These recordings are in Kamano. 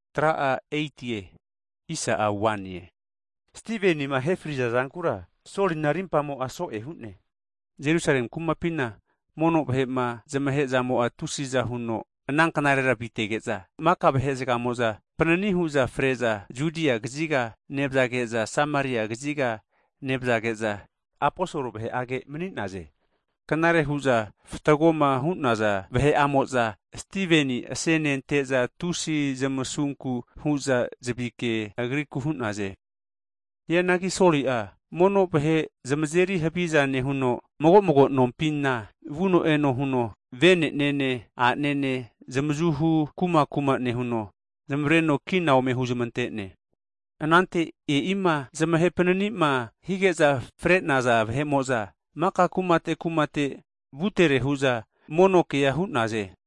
Hagi Stivenima ahe fri'za zankura Solina rimpamo'a so'e hu'ne. Jerusalemi kumapina mono vahe'ma zamahe'zamo'a tusiza huno ana knarera avitege'za, maka vahe zagamo'za panini hu'za fre'za Judia kaziga nevazage'za, Sameria kaziga nevzage'za aposol vahe'age mani'naze. Knare hu'za fatgoma hu'naza vahe'amo'za Stiveni asenente'za, tusi zamasunku hu'za zavike agriku hu'naze. Hianagi Soli'a, mono vahe zamazeri haviza nehuno, mago'mago nompina vuno eno huno vene'nene, a'nene zamavazu hu megi nezmatreno zamavareno kina ome huzmante'ne. Anante e'ima zamahe pananima hige'za fre'naza vahe'mo'za, maka kumate kumate vutere hu'za mono kea hu'naze.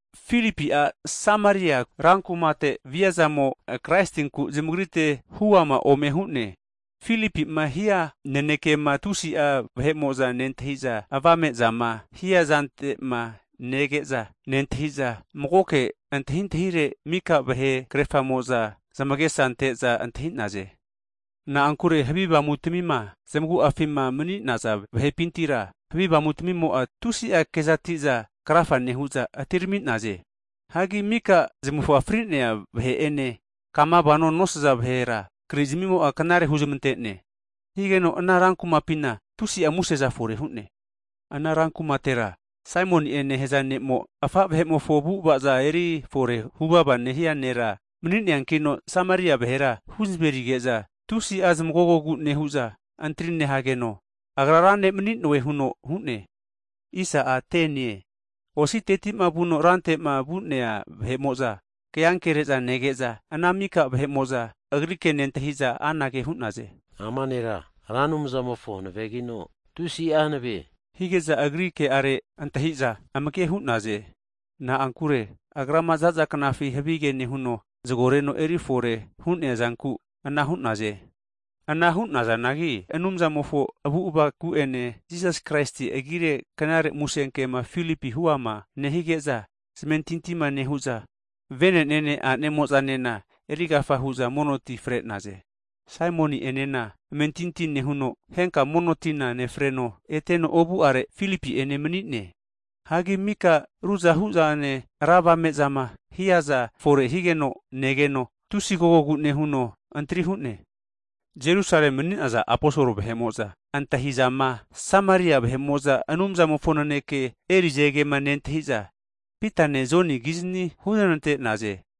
Filipi'a Sameria rankumate viazamo, Kraisinku zamagrite huama ome hu'ne. Filipi'ma hia nanekema tusi'a vahe'mo'za nentahiza, avame'zama hiazante'ma nege'za nentahiza, magoke antahintahire mika vahe krerafamo'za zamagesa ante'za antahi'naze. Na'ankure havi avamu'tamima zamagu'afima mani'naza vahe'pintira, havi avamutmimo'za tusi'a kezati'za krafa nehu'za atirami'naze. Hagi mika zamufa fri'nea vahe'ene, kama vano nosaza vahera krizamimo'a knare huzmante'ne. Higeno ana rankumapina tusi'a museza fore hu'ne. Ana rankumatera, Saimoni'e nehaza ne'mo, afa' vahe'mofo avu'ava'za eri fore huvava nehia nera mani'neankino, Sameria vahera huzamerige'za tusi'a zamagogogu nehu'za antri nehageno, agra ra ne' mani'noe huno hu'ne. Hagi ositetima vuno rante'ma vu'nea vahe'mo'za, ke'ankere'za nege'za ana mika vahe'mo'za agri ke nentahi'za anage hu'naze, Ama nera, Ra Anumzamofo hanavegino, tusi'a hanave hu'za hu'naze. Hige'za agri ke'are antahi'za amage ante'naze. Na'ankure agrama za'za knafi havige nehuno, zagoreno eri fore hu'neazanku anara hu'naze. Ana hu'nazanagi Anumzamofo kumamofo avu'avaku'ene, Jisas Kraisi agire Knare Musenkema Filipi huama nehige'za zamentintima nehu'za, vene'nene, a'nemo'zanena erigafa hu'za monoti fre'naze. Saimoni'enena amentinti nehuno henka mono tina nefreno eteno ovu'are Filipi'ene mani'ne. Hagi mika ruzahu zane ra avame'zama hiaza fore higeno negeno tusi agogogu nehuno antri hu'ne. Jerusalemi mani'naza aposol vahe'mo'za antahizama Sameria vahe'mo'za Anumzamofo naneke erize kema nentahi'za, Pitane Joni kizni huznante'naze.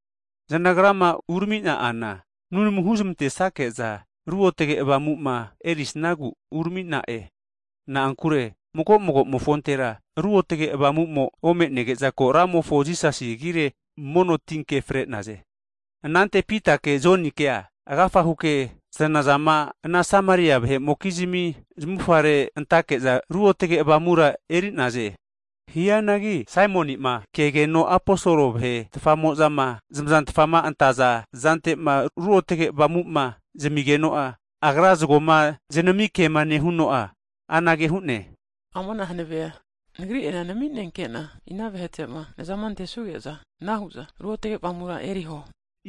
Zanagrama uramina'ana nunamu huzmante'sake'za Ruotge Avamu'ma erisnagu urami'na'e. Na'ankure mago mago'mofontera Ruotge Avamumo ome'nege'za, ko Ramofo Jisasi agire mono tinke fre'naze. Anante Pita'ene Jonikea agafa huke zanazama ana Sameria vahe'mokizmi zamufare antake'za Ruotge Avamura eri'naze. Hianagi Saimoni'ma kegeno Aposol vahe tfamo'zama zamazantfama antaza zante'ma Ruotge Avamu'ma zamigeno'a, agra zagoma zanamikema nehuno'a, anage hu'ne, Amana hanave'a nagri'enena nami'nenkena ina vahe'tema nazama antesuge'za anahu'za Ruotge Avamura eriho.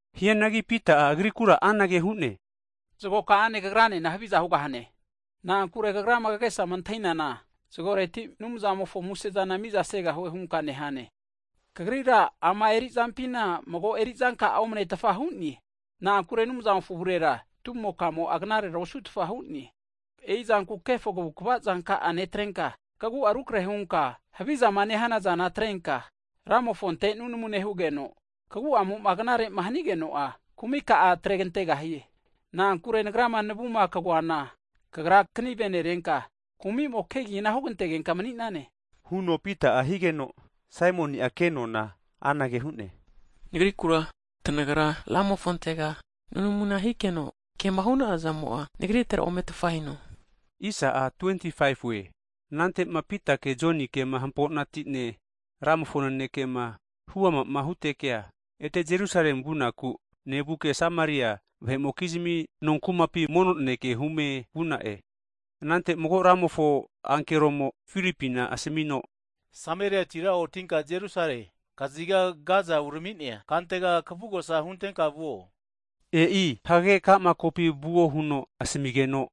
Hianagi Pita'a, agrikura anage hu'ne, Zago ka'ane kagranena haviza hugahie. Na'ankure kagrama kagesama antahinana zagoreti Anumzamofo muse'zana miza hugahue hunka nehane. Kagrira ama eri'zampina mago eri'zanka'a omanetfa hu'ne. Na'ankure Anumzamofo avurera, tumoka'amo'a knarera osu'tfa hu'ne. E'i zanku kefo kavukva zanka'a neterenka, kagu'a rukarehe hunka havizama nehana zana atrenka, Ramofonte nunamu nehugeno, kagu'amo'a knarema hanigeno'a kumi ka'a atregantegahie. Na'ankure nagrama navuma kagoana, kagra kanive nerenka, kumi'mo kegina hugantegenka mani'nane, huno Pita'a higeno, Saimoni'a ke nona anage hu'ne, Nagrikura, tanagra Ramofontega nunamuna hikeno, kema hu'na'a zamo'a nagritera ometfa hino hu'ne. Anante'ma Pita'ene Jonikema hamponati'ne, Ramofo nanekema huama'ma hutekea, ete Jerusalemi vunaku nevuke, Sameria vahe'mokizmi nonkumapi mono naneke hume vuna'e. Anante mago Ramofo ankeromo Filipina asamino, Sameriatira otinka Jerusalemi kaziga Gaza urami'nea kantega kavugosa huntenka vuo. E'i, hagage ka'ma kopi vuo huno asamigeno,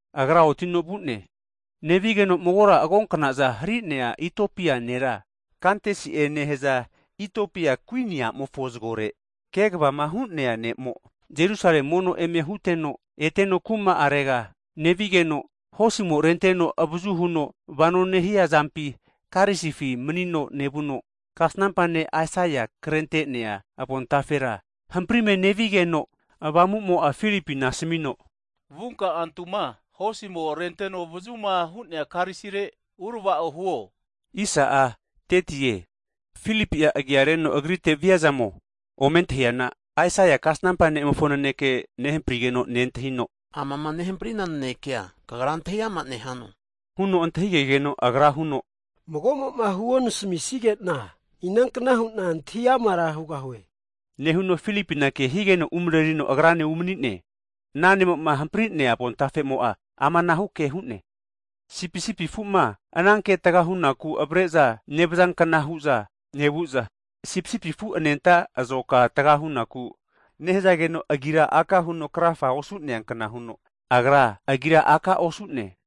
nevigeno magora agonkna'za hari'nea Itiopia nera, Kantesi'e nehaza Itiopia kuini a'mofo zagore kegavama hu'nea ne'mo, Jerusalemi mono eme huteno eteno kuma'arega nevigeno, hosimo renteno avazu huno vano nehia karisifi manino nevuno, kasnampa ne' Aisaia krente'nea avontafera hamprime nevigeno Ruotge Avamu'mo'a Filipina asamino, Vunka antuma hosimo renteno avazuma hu'nea karisire urava'o huo higeno, Filipi'a agiareno agrite viazamo ome antahiana, Aisaia kasnampa ne'mofo naneke nehamprigeno nentahino, amama nehamprina nanekea, kagra antahiama nehano? Huno antahige'geno, Ana ne'mo'a huno, Mago'mo'ma huonasamisigena, inankna hu'na antahi amara hugahue? Nehuno Filipina ke higeno umarerino agrane umani'ne. Ana ne'mo'ma hampri'nea avontafemo'a, amanahu ke hu'ne, Sipisipi afu'ma ananke taga hunaku avare'za nevazankna hu'za avre'za nevu'za, sipisipi afu anenta azoka taga hunaku nehazageno, agira aka huno krafa osu'nea kna huno, Agra agira aka osu'ne.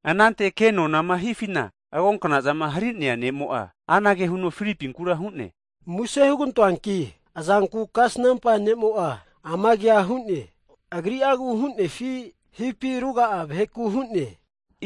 Anante ke'nonama hifina, agonkna'zama hari'nea ne'mo'a anage huno, Filipinkura hu'ne, Muse hugantoanki (plis) azanku kasnampa ne'mo'a ama kea hu'ne, agri'agu hu'nefi, hipi ruga'a vaheku hu'ne?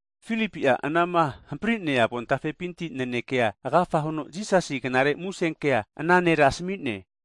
Filipi'a anama hampri'nea avontafepinti nanekea agafa huno, Jisasi knare musenkea ana nera asmi'ne.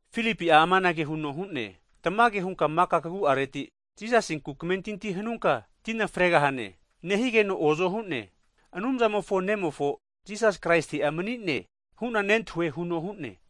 [Filipi amanage huno hu'ne, Tamage hunka maka kagu'areti Jisasinku kamentinti hanunka tina fregahane nehigeno ozo hu'ne. Anumzamofo nemofo Jisasi Kraisi'a mani'ne, hu'na namentintia nehue huno hu'ne,]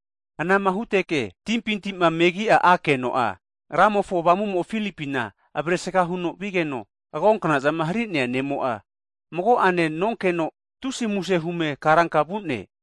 Anama huteke timpinti'ma megi'a akeno'a, Ramofo Avamumo Filipina avaresga huno vigeno, agonkna'zama hari'nea ne'mo'a mago'ane nonkeno, tusi muse hume karanka vu'ne.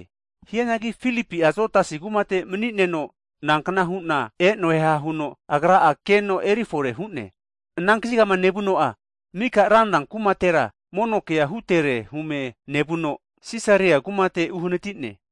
Hianagi Filipi'a Azotasi kumate mani'neno nankna hu'na e'noeha huno agra'a keno erifore hu'ne. Ana kazigama nevuno'a mika ranra kumatera mono kea hutere hume nevuno Sisaria kumate uhanati'ne.